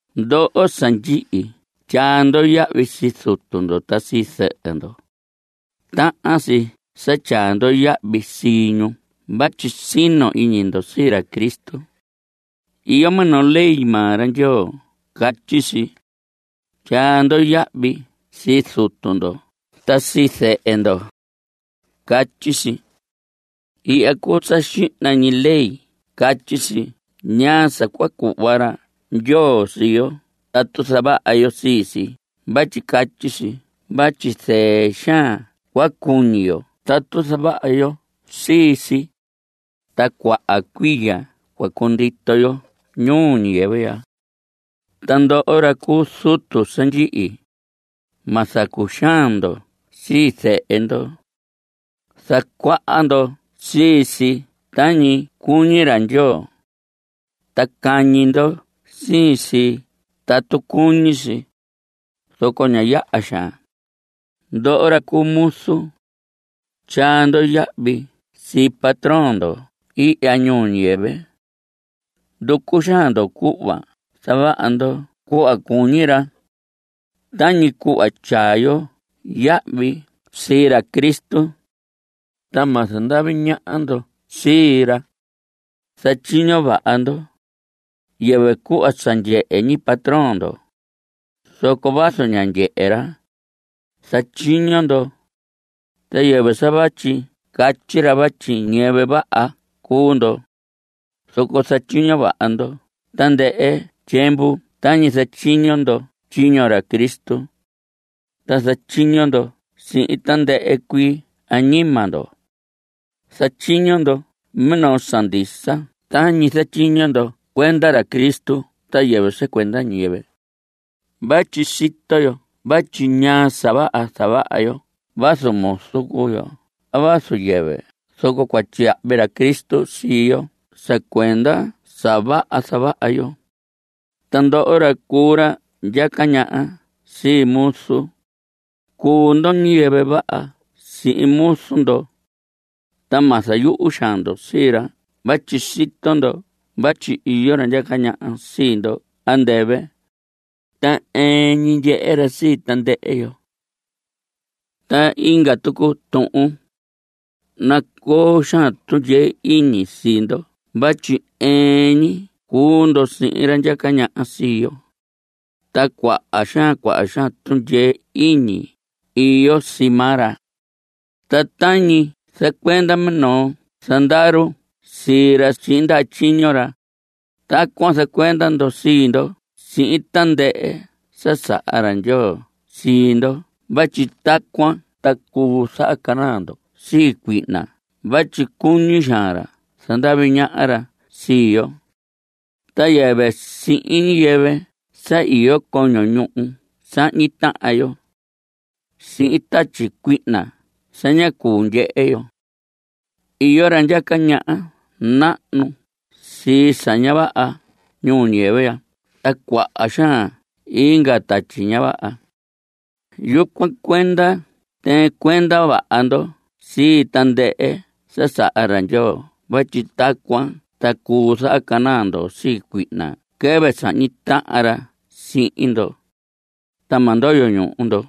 Ndoho sa ndyihi tyaa ndo yahvi sii zutu ndo ta sii zɨhɨ ndo. Tahan si sa tyaa ndo yahvi sii ñu vatyi sino iñi ndo sii ra Cristo. Iyo minoo ley maa ra Ndyoo catyi si: “Tyaa ndo yahvi sii zutu ndo ta sii zɨhɨ ndo.” Catyi si. Ihya cuu sa xihna ñi ley i catyi si ñaa sa cua cuhva ra Ndyoo sii yo tatu zavaha yo sii si vatyi catyi si vatyi zɨɨ xaan cua cuñi yo tatu zavaha yo sii si, ta cuaha cuiya cua cundito yo ñuu ñiyɨvɨ ya. Ta ndoho ra cu zutu sa ndyihi, ma zacuxaan ndo sii zehe ndo. Zacuaha ndo sii si tañi cuñi ra Ndyoo, ta cañi ndo sii si tatu cuñi si, zoco ña yaha xaan. Ndoho ra cu muzu, tyaa ndo yahvi sii patrón ndo ihya ñuu ñiyɨvɨ. Nducu xaan ndo cuhva zavaha ndo cuhva cuñi ra, tañi cuhva tyaa ndo yahvi sii ra Cristo. Ta ma zandavi ñaha ndo sii ra. Zatyiño vaha ndo, yɨvɨ cuhva sa ndyehe ñi patrón ndo, zoco vazu ña ndyehe ra, zatyiño ndo. Ta yɨvɨ sa vatyi catyi ra vatyi ñiyɨvɨ vaha cuu ndo, zoco zatyiño vaha ndo tandɨhɨ tyiemvu tañi zatyiño ndo tyiño ra Cristo, ta zatyiño ndo sihin tandɨhɨ cuii añima ndo. Zatyiño ndo minoo sa ndisa tañi zatyiño ndo cuenda ra Cristo ta yɨvɨ sa cuenda ñiyɨvɨ. Vatyi sito yo vatyi ñaa sa vaha zavaha yo vazu muzu cuu yo a vazu yɨvɨ zoco cua tyiyahvi ra Cristo sii yo sa cuenda sa vaha zavaha yo. Ta ndoho ra cu ra ndyaca ñaha sii muzun, cuu ndo ñiyɨvɨ vaha sihin muzu ndo. Ta ma zayuhu xaan ndo sii ra vatyi sito ndo vatyi iyo ra ndyaca ñaha sii ndo andɨvɨ, ta ɨɨn ñi ndyehe ra sii tandɨhɨ yo. Ta inga tucu tuhun, nacoo xaan tundyee iñi sii ndo vatyi ɨɨn ñi cuu ndo sihin ra ndyaca ñaha sii yo, ta cuaha xaan cuaha xaan tundyee iñi iyo sii maa ra. Ta tañi zacuenda minoo zandaru sii ra sihin ndaha tyiño ra, tacuan zacuenda ndo sii ndo sihin tandɨhɨ sa saha ra Ndyoo sii ndo vatyi tacuan ta cuu zahacanaa ndo sii cuihna vatyi cuñi xaan ra zandavi ñaha ra sii yo. Ta yɨvɨ sihin ñiyɨvɨ sa iyo coño ñuhu sahñi tahan yo, sihin tatyi cuihna sa ña cuu ndyehe yo. Iyo ra ndyaca ñaha nahnu sii sa ña vaha ñuu ñiyɨvɨ ya ta cuaha xaan inga tatyi ña vaha. Yucuan cuenda tɨɨn cuenda vaha ndo sii tandɨhɨ sa saha ra Ndyoo vatyi tacuan ta cuu zahacanaa ndo sii cuihna quɨvɨ sahñi tahan ra sihin ndo, ta ma ndoyo ñuhu ndo.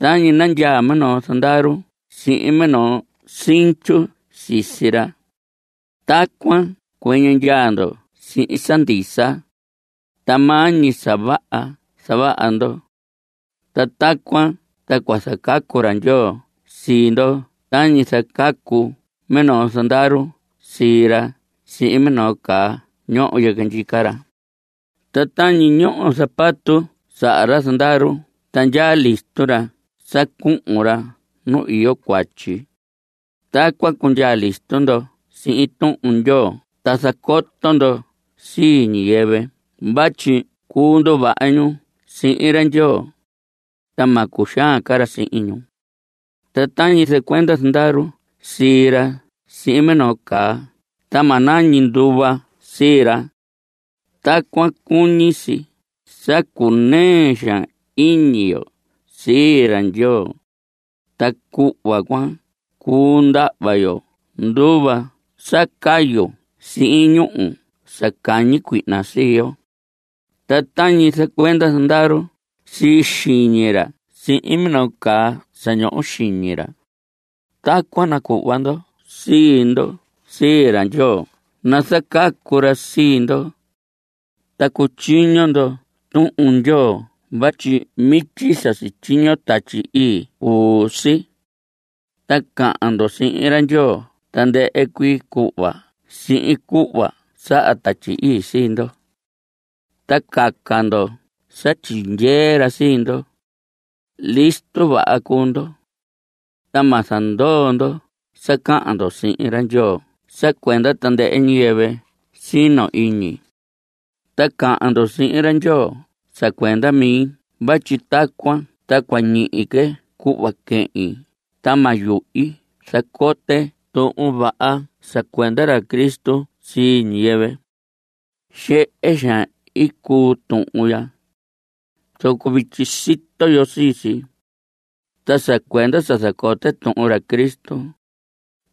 Tañi nandyaa minoo zandaru sihin minoo sinchu sisi ra, tacuan cuɨñɨ ndyaa ndo sihin sa ndisa. Ta maa ñi sa vaha zavaha ndo. Ta tacuan ta cua zacacu ra Ndyoo sii ndo tañi zacacu minoo zandaru sii ra sihin minoo caa ñoho yɨquɨ ndyica ra. Ta tañi ñoho zapato saha ra zandaru ta ndyaa listo ra sa cuhun ra nu iyo cuatyi, tacuan cundyaa listo ndo sihin Tuhun Ndyoo ta zacoto ndo sii ñiyɨvɨ vatyi cuu nduvaha ñu sihin ra Ndyoo, ta ma cuxaan ca ra sihin ñu. Ta tañi zacuenda zandaru sii ra sihin minoo caa ta ma nañi nduva sii ra, tacuan cuñi si sa cunɨɨ xaan iñi yo sii ra Ndyoo. Ta cuhva cuan cuu ndahva yo nduva sa cayu sihin ñuhu sa cañi cuihna sii yo. Ta tañi zacuenda zandaru sii xiñi ra sihin minoo caa sa ñoho xiñi ra, tacuan nacuhva ndo sii ndo sii ra Ndyoo nazacacu ra sii ndo. Ta cutyiño ndo Tuhun Ndyoo vatyi mityi sa sityiño Tatyi Ii cuu si. Ta cahan ndo sihin ra Ndyoo tandɨhɨ cuii cuhva sihin cuhva saha Tatyi Ii sii ndo. Ta caca ndo sa tyindyee ra sii ndo. Listo vaha cuu ndo, ta ma zandoo ndo sa cahan ndo sihin ra Ndyoo sa cuenda tandɨhɨ ñiyɨvɨ sino iñi. Ta cahan ndo sihin ra Ndyoo sa cuenda mi vatyi tacuan ta cua ñihi que cuhva quehin ta ma yuhi zacote Tuhun Vaha sa cuenda ra Cristo sii ñiyɨvɨ. Xehe xaan i cuu tuhun ya, zoco vityi sito yo sii si. Ta sa cuenda sa zacote tuhun ra Cristo,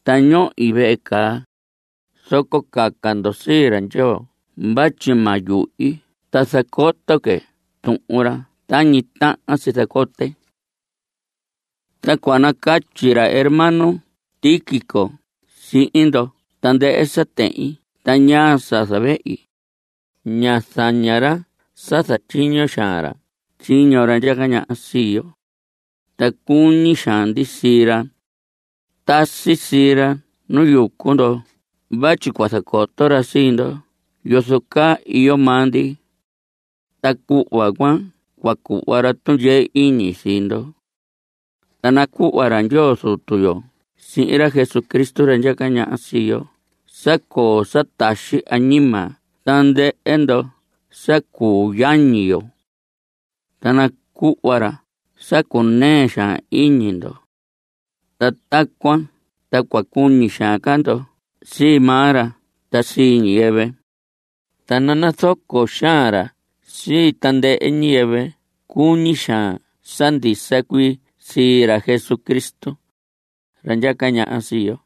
ta ñohi vehe caa, zoco caca ndo sii ra Ndyoo vatyi ma yuhi ta zacoto que tuhun ra tañi tahan si zacote. Ta cua nacatyi ra hermano Tíquico sihin ndo tandɨhɨ sa tehin ta ñaa sa zavehi. Ña zaña ra sa zatyiño xaan ra tyiño ra ndyaca ñaha sii yo, ta cuñi xaan ndi sii ra. Tasi sii ra nu yucu ndo vatyi cua zacoto ra sii ndo yozo caa iyo maa ndi, ta cuhva cuan cua cuhva ra tundyee iñi sii ndo. Ta nacuhva ra Ndyoo Zutu yo sihin ra Jesucristo ra ndyaca ñaha sii yo sa coo sa taxi añima tandɨhɨ ndoho sa cuu yañi yo. Ta nacuhva ra sa cunɨɨ xaan iñi ndo. Ta tacuan ta cua cuñi xaan ndo sii maa ra ta sii ñiyɨvɨ. Ta nanazoco xaan ra sii tandɨhɨ ñiyɨvɨ cuñi xaan sa ndisa cuii sii ra Jesucristo, ra ndyaca ñaha sii yo.